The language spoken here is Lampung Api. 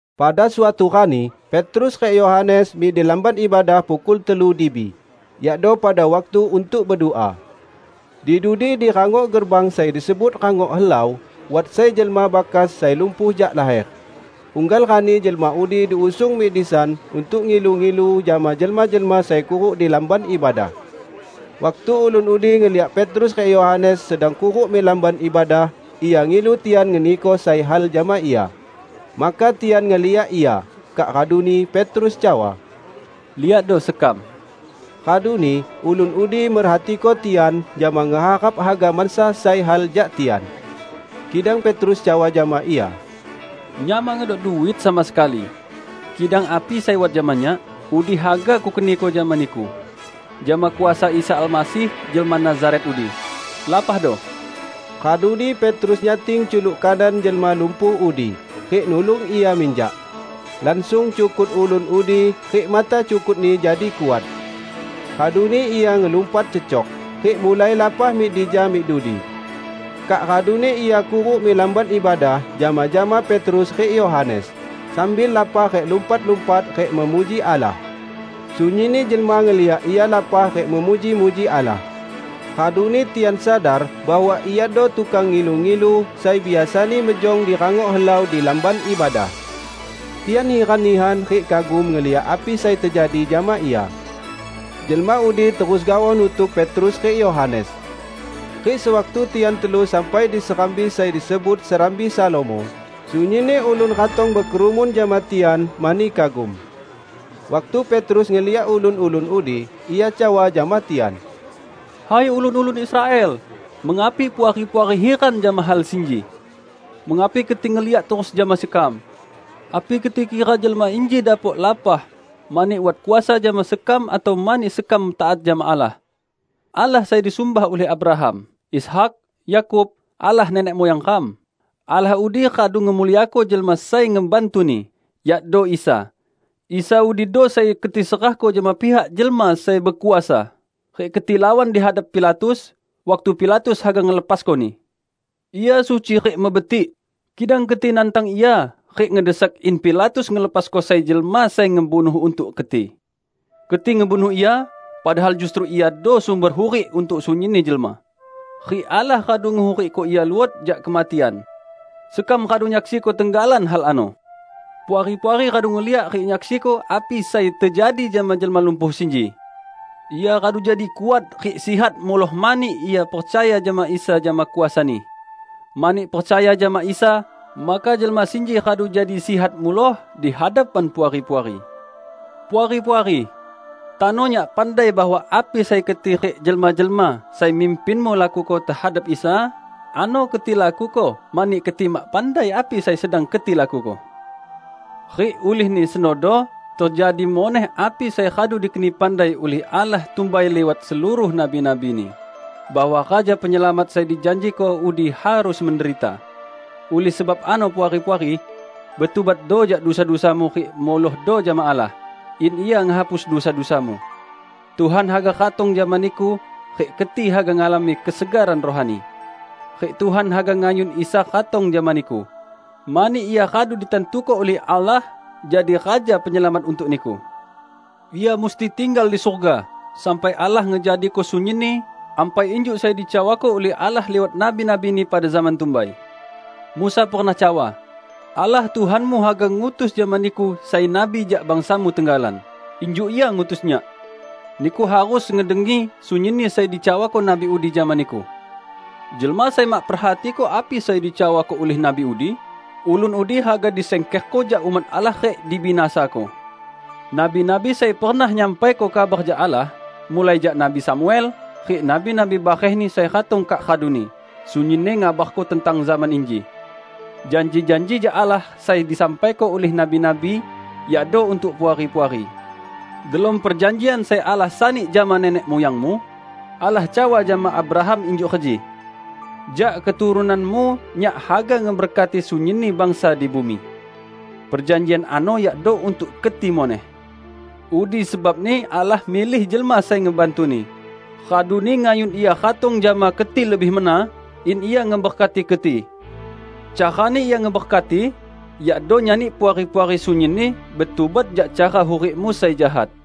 Pada suatu rani Petrus rik Yohanes mik di Lamban Ibadah pukul telu dibi, yakdo pada waktu untuk bedua. Di dudi di rangok gerbang sai disebut "Rangok Helau", wat sai jelma bakas sai lumpuh jak laher. Unggal rani jelma udi diusung mik disan untuk ngilu-ngilu jama jelma-jelma sai kuruk di Lamban Ibadah. Waktu ulun udi ngeliak Petrus rik Yohanes sedang kuruk mik Lamban Ibadah, ia ngilu tian ngeniko sai hal jama ia. Maka tian ngeliak ia, kak raduni Petrus cawa, "Liakdo sekam!" Raduni ulun udi merhatiko tian jama ngeharap haga mansa sai hal jak tian. Kidang Petrus cawa jama ia, "Nyak mak ngedok duit sama sekali. Kidang api sai wat jama nyak, udi haga kukeniko jama niku: Jama kuasa Isa Almasih jelma Nazaret udi, lapahdo!" Raduni Petrus nyating culuk kanan jelma lumpuh udi rik nulung ia minjak. Langsung cukut ulun udi rik mata cukutni jadi kuat. Raduni ia ngelumpat cecok, rik mulai lapah mik dija mik dudi. Kak raduni ia kuruk mik Lamban Ibadah jama-jama Petrus rik Yohanes, sambil lapah rik lumpat-lumpat rik memuji Allah. Sunyinni jelma ngeliak ia lapah rik memuji-muji Allah. Raduni tian sadar bahwa iado tukang ngilu-ngilu sai biasani mejong di "Rangok Helau" di Lamban Ibadah. Tian hiran nihan rik kagum ngeliak api sai tejadi jama ia. Jelma udi terus gaoh nutuk Petrus rik Yohanes. Rik sewaktu tian telu sampai di serambi sai disebut "Serambi Salomo", sunyinni ulun ratong bekerumun jama tian mani kagum. Waktu Petrus ngeliak ulun-ulun udi, ia cawa jama tian, "Hai ulun-ulun Israel, mengapi Puari-puari hiran jama hal sinji? Mengapi keti ngeliak terus jama sekam? Api keti kira jelma inji dapok lapah mani wat kuasa jama sekam atau mani sekam taat jama Allah? Allah sai disumbah ulih Abraham, Ishak, Yakub, Allah nenek muyang ram, Allah udi radu ngemuliako Jelma Sai Ngebantu-Ni, yakdo Isa. Isa udido sai keti serahko jama pihak jelma sai bekuasa, rik keti lawan di hadap Pilatus, waktu Pilatus haga ngelepasko-Ni. Ia suci rik mebetik, kidang keti nantang Ia rik ngedesak in Pilatus ngelepasko sai jelma sai ngebunuh untuk keti. Keti ngebunuh Ia, padahal justru Iado sumber hurik untuk sunyinni jelma. Rik Allah radu ngehurikko Ia luot jak kematian. Sekam radu nyaksiko tenggalan hal ano. Puari-puari radu ngeliak rik nyaksiko api sai tejadi jama jelma lumpuh sinji. Ia radu jadi kuat rik sihat muloh mani ia percaya jama Isa jama kuasa-Ni. Mani percaya jama Isa maka jelma sinji radu jadi sihat muloh di hadapan Puari-puari. Puari-puari! Tano nyak pandai bahwa api sai keti rik jelma-jelma sai mimpinmu lakuko tehadap Isa, ano keti lakuko mani keti mak pandai api sai sedang keti lakuko. Rik ulihni senodo tejadi muneh api sai radu dikeni pandai ulih Allah tumbai liwat seluruh nabi-nabi-Ni, bahwa Raja Penyelamat sai dijanjiko udi harus menderita. Ulih sebab ano Puari-puari, betubatdo jak dusa-dusamu rik mulohdo jama Allah, in Ia ngehapusko dusa-dusamu. Tuhan haga ratong jama niku rik keti haga ngalami kesegaran rohani. Rik Tuhan haga ngayun Isa ratong jama niku, mani Ia radu ditantuko ulih Allah jadi Raja Penyelamat untuk niku. Ia musti tinggal di surga sampai Allah ngejadiko sunyinni ampai injuk sai dicawako ulih Allah liwat nabi-nabi-Ni pada zaman tumbai. Musa pernah cawa, 'Allah Tuhanmu haga ngutus jama niku sai nabi jak bangsamu tenggalan, injuk Ia ngutus nyak. Niku harus ngedengi sunyinni sai dicawako nabi udi jama niku. Jelma sai mak perhatiko api sai dicawako ulih nabi udi, ulun udi haga disingkerko jak umat Allah rik dibinasako.' Nabi-nabi sai pernah nyampaiko kabar jak Allah, mulai jak Nabi Samuel rik nabi-nabi barehni sai ratong kak raduni, sunyinni ngabarko tentang zaman inji. Janji-janji jak Allah sai disampaiko ulih nabi-nabi yakdo untuk Puari-puari. Delom perjanjian sai Allah sani jama nenek muyangmu, Allah cawa jama Abraham injuk reji, 'Jak keturunanmu Nyak haga ngeberkati sunyinni bangsa di bumi.' Perjanjian ano yakdo untuk keti muneh. Udi sebabni Allah milih Jelma Sai Ngebantu-Ni, raduni ngayun Ia ratong jama keti lebih mena, in Ia ngeberkati keti. Carani Ia ngeberkati yakdo nyani Puari-puari sunyinni betubat jak cara hurikmu sai jahat."